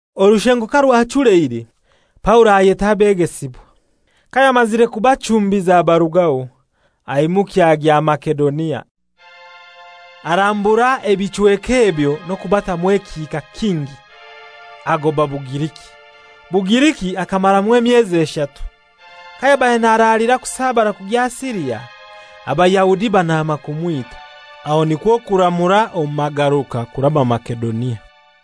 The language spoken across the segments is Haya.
Orushengo karwachuleire, Paulo ayeta abegesibwa. Kayamazire kubachumbiza abarugaho, aimukya agya Masedonia. Arambura ebichweka ebyo n'okubatamu ekihika kingi, agoba Bugiriki. Bugiriki akamaramu emyezi eshatu. Kayabaire naralira kusabara kugya Siria, Abayahudi banaama kumwita. Aho nikwo kuramura omu magaruka kuraba Masedonia.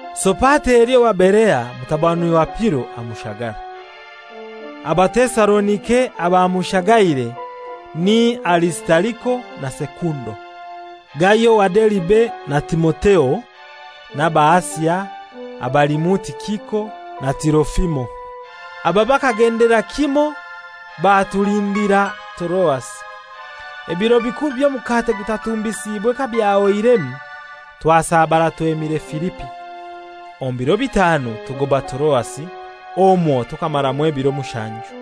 Sopateri owa Berea mutabani wa Piro, amushagara. Abatesalonika abamushagaire ni Arisitariko na Sekundo; Gayo owa Deribe, na Timotheo; n'Abaasia abalimu Tikiko na Tirofimo. Aba bakagendera kimoi batulindira Toroasi. Ebiro bikuru by'Omukate Gutatumbisiibwe kabyahoiremu twasabara twemire Filipi. Omu biro bitanu tugoba Toroasi, omwo tukamaramu ebiro mushanju.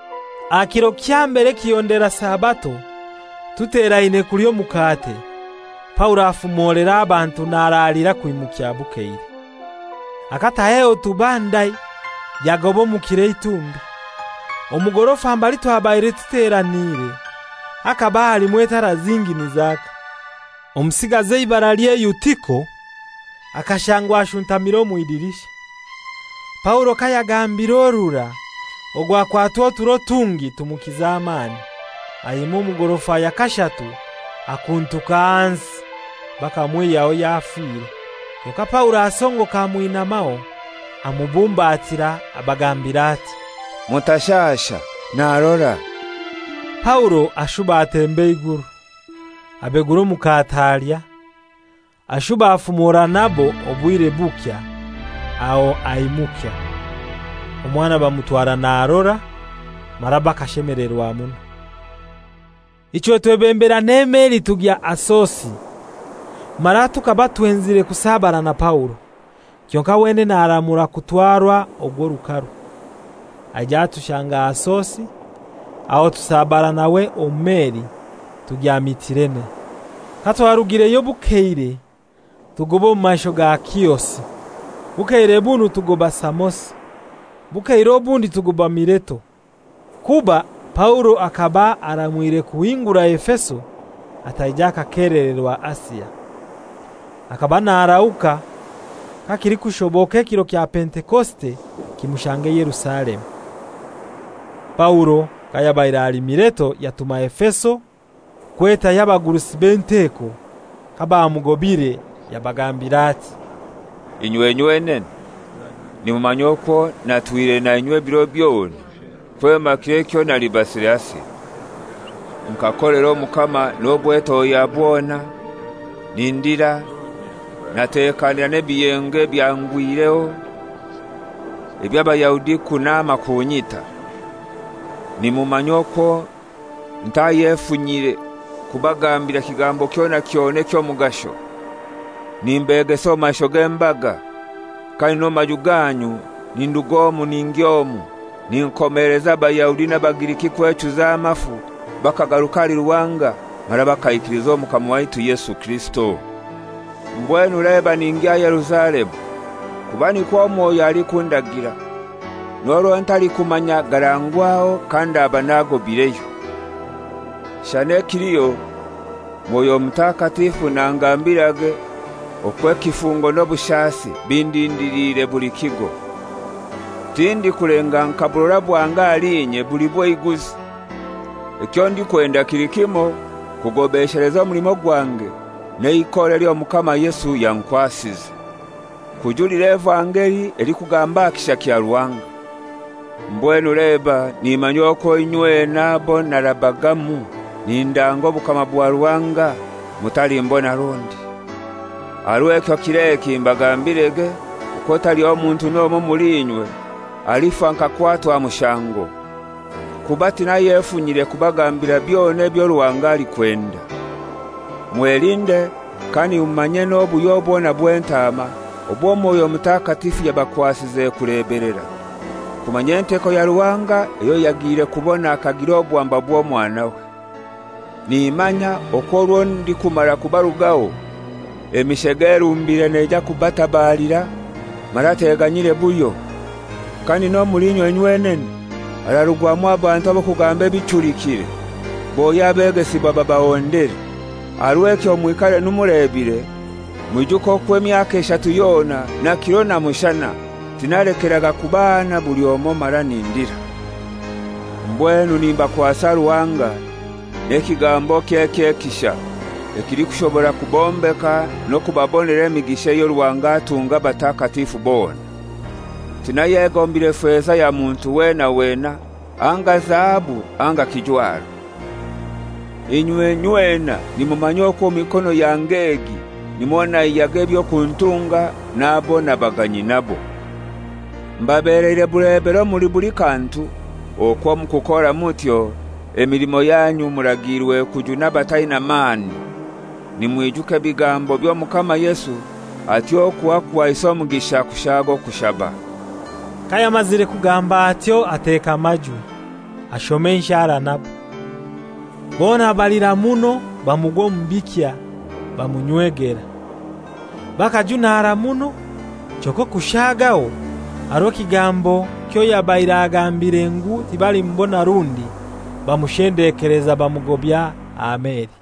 Aha kiro kya mbere ekihondera Sabato, tuteraine kulya omukate, Paulo afumolera abantu naraalira kwimukya bukeire. Akataho ehotuba ndai yagoba omu kiro eitumbi. Omu gorofa mbali twabaire tuteraniire hakaba halimu etara zingi nizaka. Omusigazi eibaralye Eutiko akashangwa ashuntamire omw'idirisha. Paulo kayagambiire orurai, ogu akwatwa oturo tungi tumukiza amani, ayema omu gorofa ya kashatu akuntuka ahansi, bakamwihyaho yafire. Kyonkai Paulo asongoka amwinamaho amubumbatira, abagambira ati, «Mutashasha, narora.» Paulo ashuba atemba eiguru. Abegura omukate alya, ashuba afumora nabo obwire bukya, aho aimukya. Omwana bamutwara narora, mara bakashemelerwa muno. Ichwe twebembera n'emeli tugya Asosi, mara tukaba twenzire kusabara na Paulo, kyonkai wenene aramura kutwarwa ogw'orukaru. Aija atushanga Asosi, aho tusabara nawe omu meli tugya Mitilene. Katwarugireyo bukeire tugoba omu maisho ga Kiosi. Bukeire bunu tugoba Samosi; bukeire obundi tugoba Mileto; kuba Paulo akaba aramwire kuhingura Efeso ataija akakelererwa Asia. Akaba narahuka kakilikushoboka ekiro kya Pentekosite kimushange Yerusalemu. Paulo kayabaire ali Mileto yatuma Efeso kwetayo abagurusi b'enteko. Kabamugobire yabagambira ati, «Inywe nywenene nimumanya okwo natwire nainywe ebiro byona kwema kiro ekyo nalibasire Asia. Nkakolera Omukama n'obwetohya bwona, nindira, natekanira n'ebiyengo ebyangwireho eby'Abayahudi kunaama kunyita. Nimumanya okwo ntayefunyire kubagambira kigambo kyona kyona eky'omugasho, nimbegesa omu maisho g'embaga, kandi n'omu maju ganyu nindug'omu ningy'omu ninkomeleza Abayahudi n'Abagiriki kwechuza amafu bakagaruka ahali Ruhanga mara bakaikiliza Omukama waitu Yesu Kirisito. Mbwenu leba ningya Yerusalemu, kuba nikwo Mwoyo alikundagira, n'orwo ntalikumanya garangwaho kandaba nagobaireyo. Shana ekiliho Mwoyo Mutakatifu nangambirage okwo ekifungo n'obushasi bindindiliire buli kigo. Tindikulenga nka burora bwange ahali inye buli bw'eiguzi. Ekyo ndikwenda kili kimoi: Kugobesheleza omulimo gwange n'eikora ely'Omukama Yesu yankwasize, kujulira evangeli elikugamba aha kisha kya Ruhanga. Mbwenu leba nimanya okwo inywena abo narabagamu nindanga obukama bwa Ruhanga mutalimbona rundi. Aha rw'ekyo kir'eki mbagambirege okwo taliho muntu n'omoi omuli inywe alifa nkakwatwa mushango, kuba tinayefunyire kubagambira byona ebyo Ruhanga alikwenda. Mwelinde, kandi mumanye n'obuhyo bwona bw'entaama obwo Mwoyo Mutakatifu yabakwasize kulebelera, kumanya enteko ya Ruhanga eyo yagiire kubona akagira obwamba bw'Omwanawe. Nimanya okwo orwo ndikumara kubarugaho, emishega erumbire neija kubatabalira mara teganyire buhyo. Kandi n'omuli inywe nywenene hararugwamu abantu ab'okugamba ebichulikire, bohye abegesibwa babahondere. Aha rw'ekyo mwikarenu mulebire, mwijuke okwo emyaka eshatu yona na kiro na mushana tinalekeraga kubahana buli omoi mara nindira. Mbwenu nimbakwasa Ruhanga n'ekigambokye eky'ekisha ekilikushobora kubombeka n'okubabonera emigisha eyo Ruhanga atunga abatakatifu bona. Tinayegombire feza ya muntu weena weena anga zahabu anga kijwaro. Inywe nyweena nimumanya okwo omu mikono yange egi nimwo naihyaga eby'okuntunga n'abo nabaga nyinabo. Mbabeleire bulebero omuli buli kantu, okwo omu kukora mutyo emilimo yanyu muragiirwe kujuna abataina mani, nimwijuka ebigambo by'Omukama Yesu ati, ‹Okuha kuhaisa omugisha kushaaga okuhaba.›» Kayamazire kugamba atyo ateka amajwi, ashoma enshara nabo. Bona balira muno bamugwa omu bikya, bamunywegera. Bakajunara muno, kyonkai okushaagaho aha rwe'kigambo kyoyabaire agambire ngu tibalimubona rundi. Bamushendekeleza bamugobya aha meli.